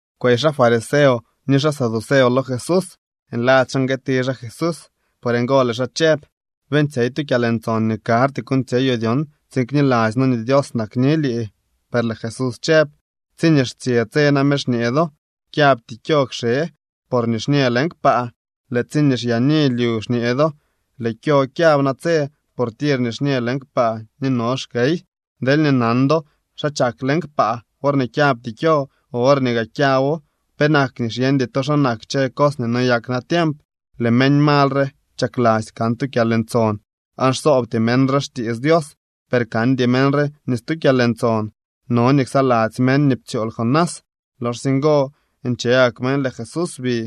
Kwey xaa fariseo ni xaa saduceo lo Jesús nladzy xaa nguëëti xaa Jesús. Por ngo lëë xaa chëb: —Beeñtsyey tu kyalntson nii karty kuuñtsyeyoo dyon tsiin kniladzy noo nii Dios nakni lii. Per lëë Jesús chëb: —Tsiñee xtsye tse name xñee do: “Kyabty kyo kxe, por nixñë leñ kpaa.” Lëë tsi xyaani lyu xñee do: “Lëë kyo kyab natse, por tir nixñë leñ kpaa ni no xkey.” Deelñee nan do xa chak leñ kpaa worñee kyabty kyo o worñee gaa kyabo, penak nii xyeñdy to xa nak kchë cos nii noyak natiemp. Lëë meñ mal re chakladzy kan tu kyalntson aan xsoobty meñ re xtiits Dios, per kandy meñ re ni stu kyalntson. No nii ksaladzy meñ nii ptsyool Jonás. Loxsye ngo nche gak meñ, lëë Jesús bi.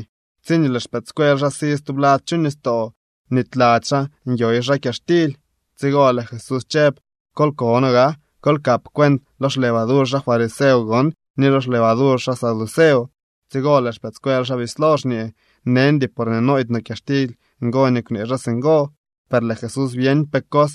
Tsiñee lëë xpëëdscuel xaa si stublad chu nistoo, bnityladzy xaa nyoy xaa kyaxtily. Tsigo lëë Jesús chëb: —Kol kono gaa. Kol kap cuent lo xlevadur xaa fariseo gon ni lo xlevadur xaa saduceo. Tsigo lëë xpëëdscuel xaa bislo xñee: —Neñdy porñee nooydy no kyaxtily, ngo nii kwnee xaa singo. Per lëë Jesús byeñ pe cos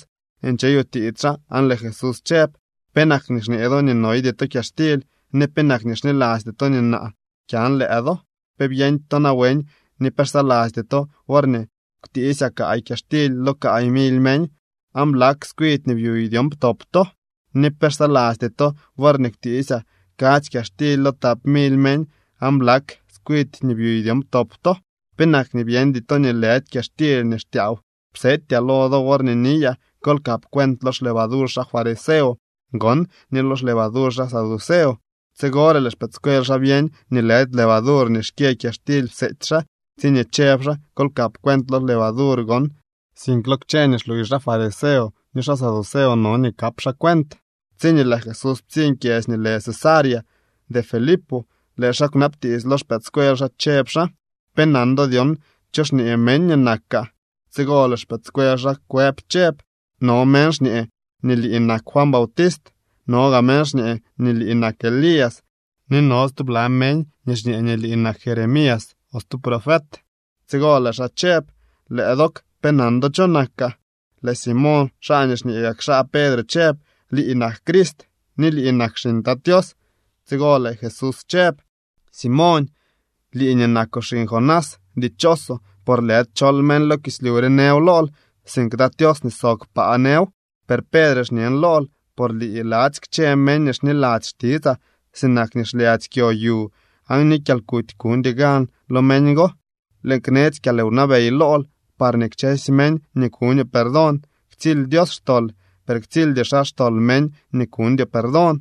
ncheyutiits xaa aan lëë Jesús chëb: —¿Penak nii xñee do nii noydy to kyaxtily ni penak nii xnilasty to nii naa kyan lëë do? ¿Pe byeñdy to nawen ni pe xsalasty to worñee kwtiisyaa kaay kyaxtily lo kaay mily meñ, aan blak tskwidy nii byuy dyon ptop to? ¿Ni pe xsalasty to worñee kwtiisyaa kadzy kyaxtily lo tap mily meñ aan blak tskwidy nii byuy dyon ptop to? ¿Penak nii byeñdy to nii lëdy kyaxtily nii xtyaaw psetyaa lo do worñee niyaa: “Kol kap cuent lo xlevadur xaa fariseo gon ni lo xlevadur xaa saduceo”? Tsigore lëë xpëëdscuel xaa byeñ nii lëdy levadur nii xkyë kyaxtily pseety xaa tsiñee chëb xaa: “Kol kap cuent lo levadur gon”, sink lo kchë nii xluuy xaa fariseo ni xaa saduceo no nii kap xaa cuent. Tsiñee lëë Jesús ptsiñ kyedzy nii lë Cesarea de Filipo, lëë xaa kwnabtiits lo xpëëdscuel xaa, chëb xaa: —¿Pe nan do dyon cho xñee meñ nii nakaa? Tsigo lëë xpëëdscuel xaa kwëb chëb: —No meñ xñee nii lii nak Juan Bautist. No gaa meñ xñee nii lii nak Elías. Ni no stubla meñ nii xñee nii lii nak Jeremías o stu profet. Tsigo lëë xaa chëb: —Lëë dook, ¿pe nan do cho nakaa? Lëë Simoñ, xaa nii xñee gak xaa Pedre chëb: —Lii nak Crist, ni lii nak xiñ Tat Tios. Tsigo lëë Jesús chëb: —Simoñ, lii nii nakoo xiñ Jonás, dichoosoo por lëdy chol meñ lo kislyu re nëw lool, sink Tat Tios nii sob kpaa nëw. Per Pedre xñen lool por lii ladzy kchë meñ nii xniladzy xtitsaa sinak nii xlyadzy kyo yu aan ni kyalkuty kuñdy gan lo meñ go. Lëën knetsy kyalwnabey lool parñee kchësy meñ nii kuñoo perdón ktsily Dios xtol, per ktsildy xaa xtol meñ nii kuñdyoo perdón.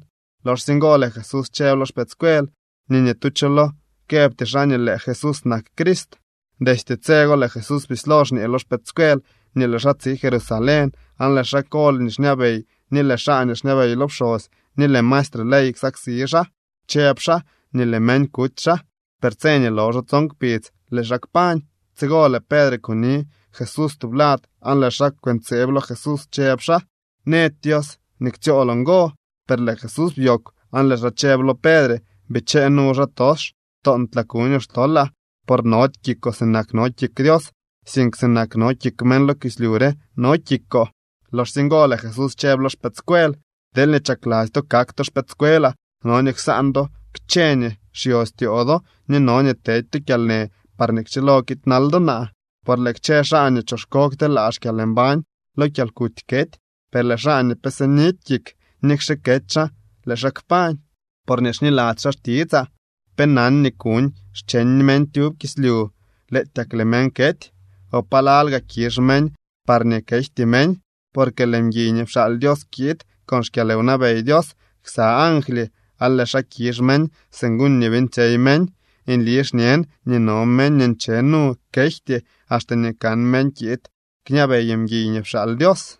Loxsye ngo lëë Jesús chëb lo xpëëdscuel nii ni tu cho lo këbty xaa nii lëë Jesús nak Crist. Destye tse go lëë Jesús bislo xñee lo xpëëdscuel nii lëë xaa tsi Jerusalén, aan lëë xaa kol nii xñabey ni lëë xaa nii xñabey lo pxosy ni lëë maestre ley ksaksi xaa. Chëb xaa nii lëë meñ kuty xaa. Per tse nii loxo tson kpidz lëë xaa kpañ. Tsigo lëë Pedre kuni Jesús tublad aan lëë xaa kwëntseeb lo Jesús, chëb xaa: —¡Nëdy Dios nii ktsyooloo ngo! Per lëë Jesús byoogw aan lëë xaa chëb lo Pedre: —¡Bichee nu, xaatox! Toontlaa kuñoo xtolaa. Por nody kikoo sinak no kik Dios, sink sinak no kik meñ lo kislyu re no kikoo. Loxsye ngo lëë Jesús chëb lo xpëëdscuel: —Deelñee chakladzy to kak to xpëëdscuelaa, no nii ksaan do kchë nii xyostyoo do ni no nii tedy to kyalnë parñee kchilo kiidnal do naa. Por lëë kchë xaa nii choxko kteelaa xkyalmbañ, lo kyalkuty kety. Per lëë xaa nii pe sinidy kik, nikxe kety xaa, lëë xaa kpañ, porñee xniladzy xaa xtitsaa. ¿Pe nan nii kuuñ xcheñ meñ tyub kislyu, lëëtyak lëë meñ kety? ¿O palal gaa kizh meñ parñee kejty meñ? Porque lëë mguiy nii pxaal Dios kiid con xkyalwnabey Dios ksa angly aan lëë xaa kizh meñ según nii beeñtsyey meñ. Nli xñen nii no meñ nii nche nu kejty axte nii kan meñ kiid kñabey mguiy ni pxaal Dios.